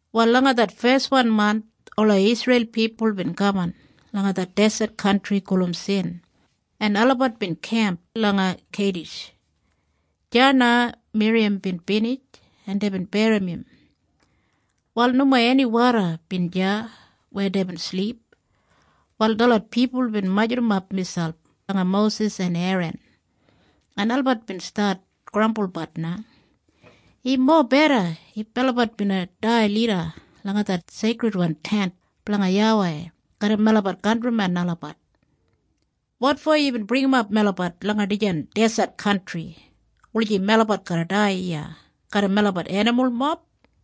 Wal langa det feswan manth ola Isreil pipul bin kaman langa det deset kantri gulum Sin en olabat bin kemp langa Keidish. Deya na Miriyam bin binij en deibin berrim im. Wal nomo eni woda bin deya weya deibin silip. Wal detlot pipul bin majurrumap miselp langa Mosis en Eran. En olabat bin stat grambulbat na, “Im mobeda if melabat bina dai lida langa det Seikridwan Tent blanga YAWEI garram melabat kantrimen olabat. Wotfo yubin bringimap melabat langa dijan deset kantri, wulijim melabat garra dai iya garram melabat enimulmob?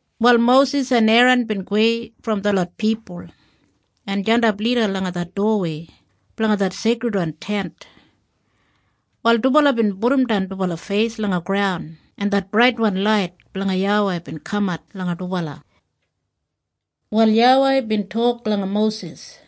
Wal Mosis en Eran bin gowei brom detlot pipul en jandap lida langa det dowawei blanga det Seikridwan Tent. Wal dubala bin pudumdan dubala feis langa graun en det braitwan lait blanga YAWEI bin kamat langa dubala. Wal YAWEI bin tok langa Mosis,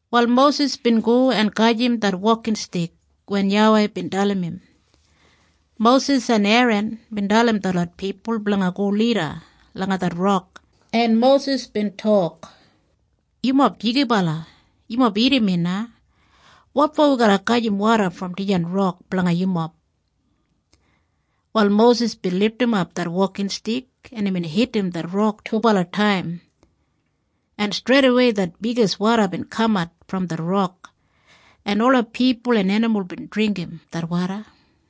Wal Mosis bin go en gajim det wokinstik wen YAWEI bin dalim im. Mosis en Eran bin dalim detlot pipul blanga go lida langa det rok, en Mosis bin tok, “Yumob jigibala, yumob irrim mi na. Wotfo wi garra gajim woda brom dijan rok blanga yumob?” Wal Mosis bin lidimap det wokinstik en imbin hidim det rok dubala taim, en streidawei det bigis woda bin kamat brom det rok, en ola pipul en enimul bin dringgim det woda.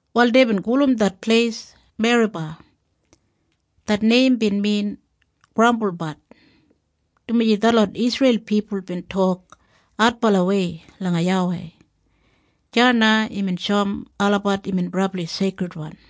Wal deibin gulum det pleis Meriba. Det neim bin min Grambulbat, dumaji detlot Isreil pipul bin tok adbalawei langa YAWEI. Deya na imbin shoum olabat imbin brabli seikridwan.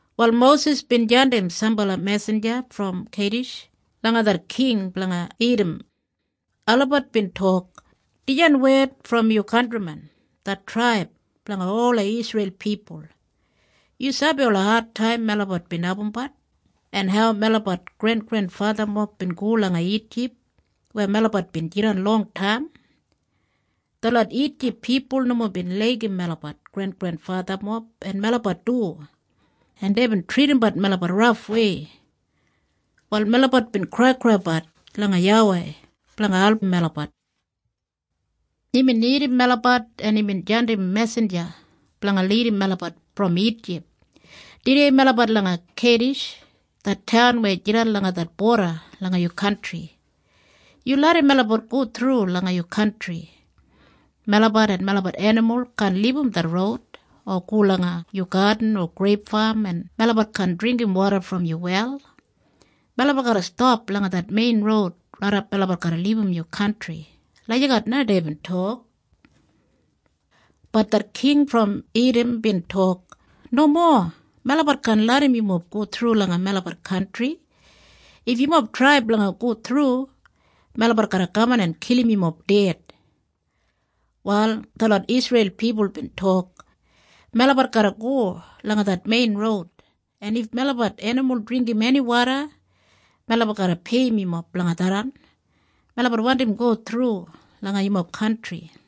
Wal Mosis bin jandim sambala mesinja brom Keidish langa det king blanga Idam. Olabat bin tok, “Dijan wed brom yu kantrimen, det traib blanga ola Isreil pipul. Yu sabi ola adtaim melabat bin abumbat, en hau melabat grengrenfathamob bin go langa Ijip weya melabat bin jidan longtaim. Detlot Ijip pipul nomo bin laigim melabat grengrenfathamob en melabat du, en deibin tridimbat melabat rafwei. Wal melabat bin kraikraibat langa YAWEI blanga album melabat. Imbin irrim melabat en imbin jandim mesinja blanga lidim melabat brom Ijip. Tudei melabat langa Keidish, det taun weya jidan langa det boda langa yu kantri. Yu larram melabat go thru langa yu kantri. Melabat en melabat enimul kaan libum det roud, o go langa yu gadin o greip fam en melabat kaan dringgim woda brom yu wel. Melabat garra stap langa det mein roud raidap melabat garra libum yu kantri.” Lagijat na deibin tok. Bat det king brom Idam bin tok, “Nomo! Melabat kaan larram yumob go thru langa melabat kantri. If yumob trai blanga go thru, melabat garra kaman en kilim yumob ded.” Wal detlot Isreil pipul bin tok, “Melabat garra go langa det mein roud, en if melabat enimul dringgim eni woda melabat garra peiyim yumob blanga tharran. Melabat wandim go thru langa yumob kantri.”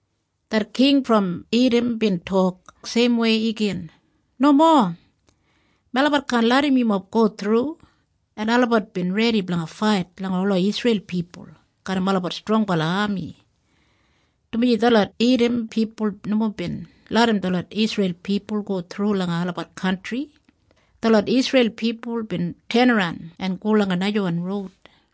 Det king brom Idam bin tok seimwei igin, “Nomo! Melabat kaan larram yumob go thru!” En olabat bin redi blanga fait langa ola Isreil pipul garram olabat strongbala ami. Dumaji detlot Idam pipul nomo bin larram detlot Isreil pipul go thru langa olabat kantri, detlot Isreil pipul bin tenaran en go langa najawan roud.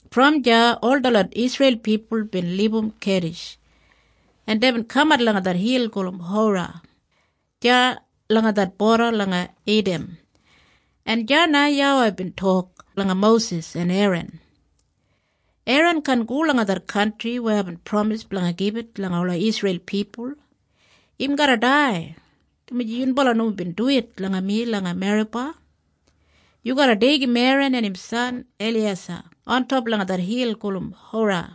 Brom deya ol detlot Isreil pipul bin libum Keidish, en deibin kamat langa det hil gulum Hora, deya langa det boda blanga Idam, en deya na YAWEI bin tok langa Mosis en Eran, “Eran kaan go langa det kantri weya aibin pramis blanga gibit langa ola Isreil pipul. Im garra dai, dumaji yunbala nomo bin duwit langa mi langa Meriba. Yu garra deigim Eran en im san Eliyeisa ontop langa det hil gulum Hora,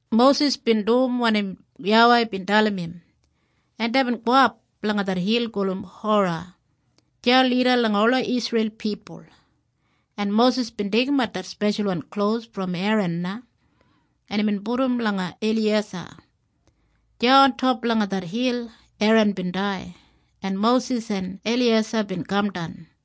Mosis bin dum wanim YAWEI bin dalim im, en deibin gowap langa det hil gulum Hora, deya lida langa ola Isreil pipul. En Mosis bin deigimat det speshalwan klos brom Eran na, en imbin pudum langa Eliyeisa. Deya ontop langa det hil Eran bin dai, en Mosis en Eliyeisa bin kamdan.